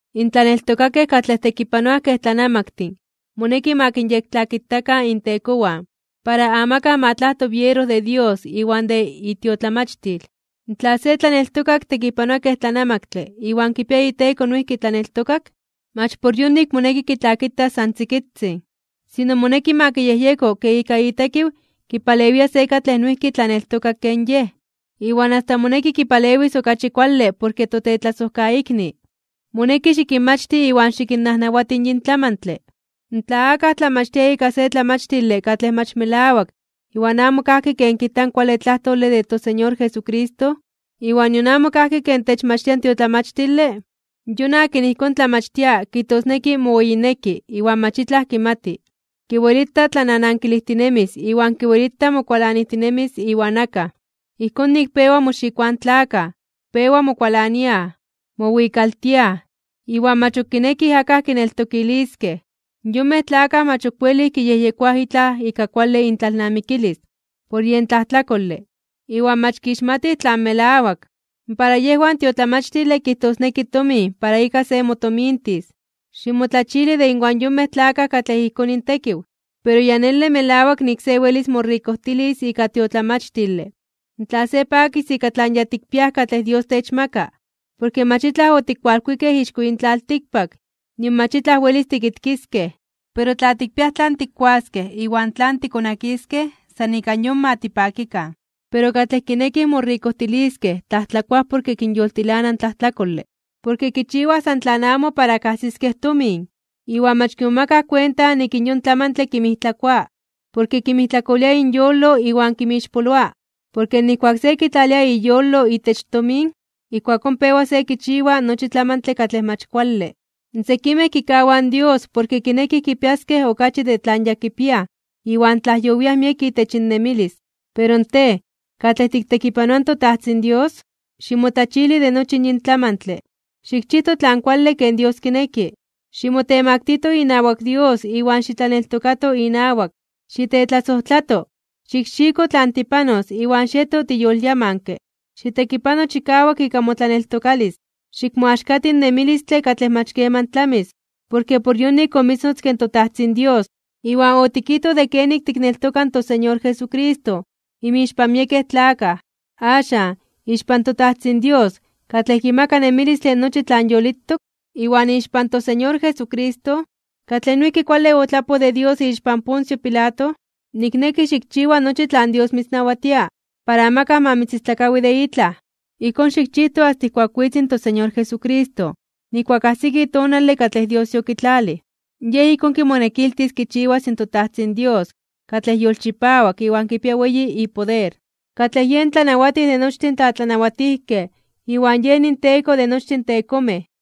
In tlaneltokakej katlej tekipanoaj kej tlanamaktin moneki ma kinyektlakitakan intekowan, para amakaj ma tlajto biero de Dios iwan de itiotlamachtil. Tla se tlaneltokak tekipanoa kej tlanamaktle iwan kipia iteko noijki tlaneltokak, mach por yonik moneki kitlakitas san tzikitzin. Sino moneki ma kiyejyeko ke ika itekiw kipalewia se katlej noijki tlaneltokak ken yej, iwan asta moneki kipalewis okachi kuale porke totetlasojkaikni. Moneki xikinmachti iwan xikinnajnawati yin tlamantle. Tla akaj tlamachtia ika se tlamachtile katlej mach melawak iwan amo kajki ken kijta in kuale tlajtole de toSeñor Jesucristo, iwan nion amo kajki ken techmachtia in tiotlamachtile, yon akin ijkón tlamachtia kijtosneki moweyineki iwan mach itlaj kimati. Kiwelita tlananankilijtinemis iwan kiwelita mokualanijtinemis iwan akaj. Ijkón nik pewa moxikoaj in tlakaj, pewa mokualaniaj, mowikaltiaj, iwan mach ok kinekij akaj kineltokiliskej. Yonmej tlakaj mach ok welij kiyejyekoaj itlaj ika kuale intlalnamikilis, por yen tlajtlakole, iwan mach kixmatij tlan melawak. Para yejwan in tiotlamachtile kijtosneki tomin para ika se motomintis. Ximotlachili de inwan yonmej tlakaj katlej ijkón intekiw. Pero ya nele melawak nik se welis morikojtilis ika tiotlamachtile, tla se pakis ika tlan ya tikpiaj katlej Dios techmaka. Porke mach itlaj otikualkuikej ixko yin tlaltikpak, nion mach itlaj welis tikitkiskej. Pero tla tikpiaj tlan tikkuaskej iwan tlan tikonakiskej, san ika yon ma tipakikan. Pero katlej kinekij morikojtiliskej tlajtlakoaj porke kinyoltilana in tlajtlakole. Porke kichiwaj san tlan amo para kajsiskej tomin, iwan mach kimomakaj kuenta nik in yon tlamantle kinmijtlakoa. Porke kinmijtlakolia inyolo iwan kinmixpoloa. Porke nijkuak se kitlalia iyolo itech tomin, ijkuakón pewa se kichiwa nochi tlamantle katlej mach kuale. Sekimej kikawaj in Dios porke kinekij kipiaskej okachi de tlan ya kipiaj iwan tlajyowiaj miek itech innemilis. Pero tej, katlej tiktekipanoa in toTajtzin Dios, ximotlachili de nochi yin tlamantle. Xikchijto tlan kuale ken Dios kineki, ximotemaktijto inawak Dios iwan xitlaneltokato inawak, xitetlasojtlato, xikxiko tlan tipanos iwan xieto tiyolyamanke. Xitekipano chikawak ika motlaneltokalis. Xikmoaxkati in nemilistle katlej mach keman tlamis, porke por yonik omitznotzke in toTajtzin Dios, iwan otikijtoj de kenik tikneltoka in toSeñor Jesucristo inmixpan miekej tlakaj. Axan, ixpan toTajtzin Dios, katlej kimaka nemilistle nochi tlan yolitok, iwan ixpan toSeñor Jesucristo, katlej noijki kuale otlapoj de Dios ixpan Poncio Pilato, nikneki xikchiwa nochi tlan Dios mitznawatia, para amakaj ma mitzistlakawi de itlaj. Ijkón xikchijto asta ijkuak witz in toSeñor Jesucristo, nijkuak ajsiki tonale katlej Dios yokitlalij, Yej ijkón kimonekiltis kichiwas in toTajtzin Dios katlej yolchipawak iwan kipia weyi ipoder, katlej yen Tlanawatij de nochtin tlatlanawatijkej iwan yen inTeko de nochtin tekomej.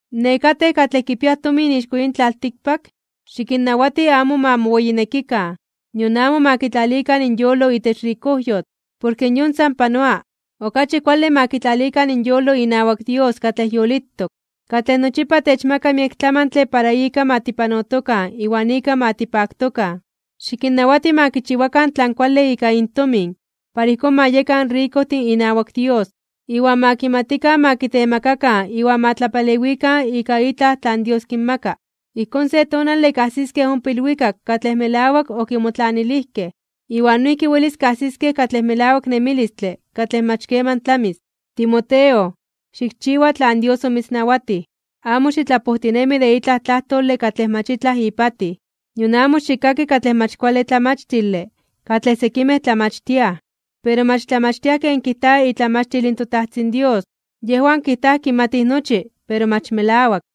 Nekatej katlej kipiaj tomin ixko yin tlaltikpak, xikinnawati amo ma moweyinekikan, nion amo ma kitlalikan inyolo itech rikojyotl. Porke yon san panoa. Okachi kuale ma kitlalikan inyolo inawak Dios katlej yolitok, katlej nochipa techmaka miek tlamantle para ika ma tipanotokan iwan ika ma tipaktokan. Xikinnawati ma kichiwakan tlan kuale ika intomin para ijkón ma yekan rikojtin inawak Dios, iwan ma kimatikan ma kitemakakan iwan ma tlapalewikan ika itlaj tlan Dios kinmaka. Ijkón, se tonale, kajsiskej ompa ilwikak katlej melawak okimotlanilijkej, iwan noijki welis kajsiskej katlej melawak nemilistle katlej mach keman tlamis. Timoteo, xikchiwa tlan Dios omitznawatij. Amo xitlapojtinemi de itlaj tlajtole katlej mach itlaj ipatij. Nion amo xikkaki katlej mach kuale tlamachtile katlej sekimej tlamachtiaj, pero mach tlamachtiaj ken kijta itlamachtil in toTajtzin Dios. Yejwan kijtaj kimatij nochi, pero mach melawak.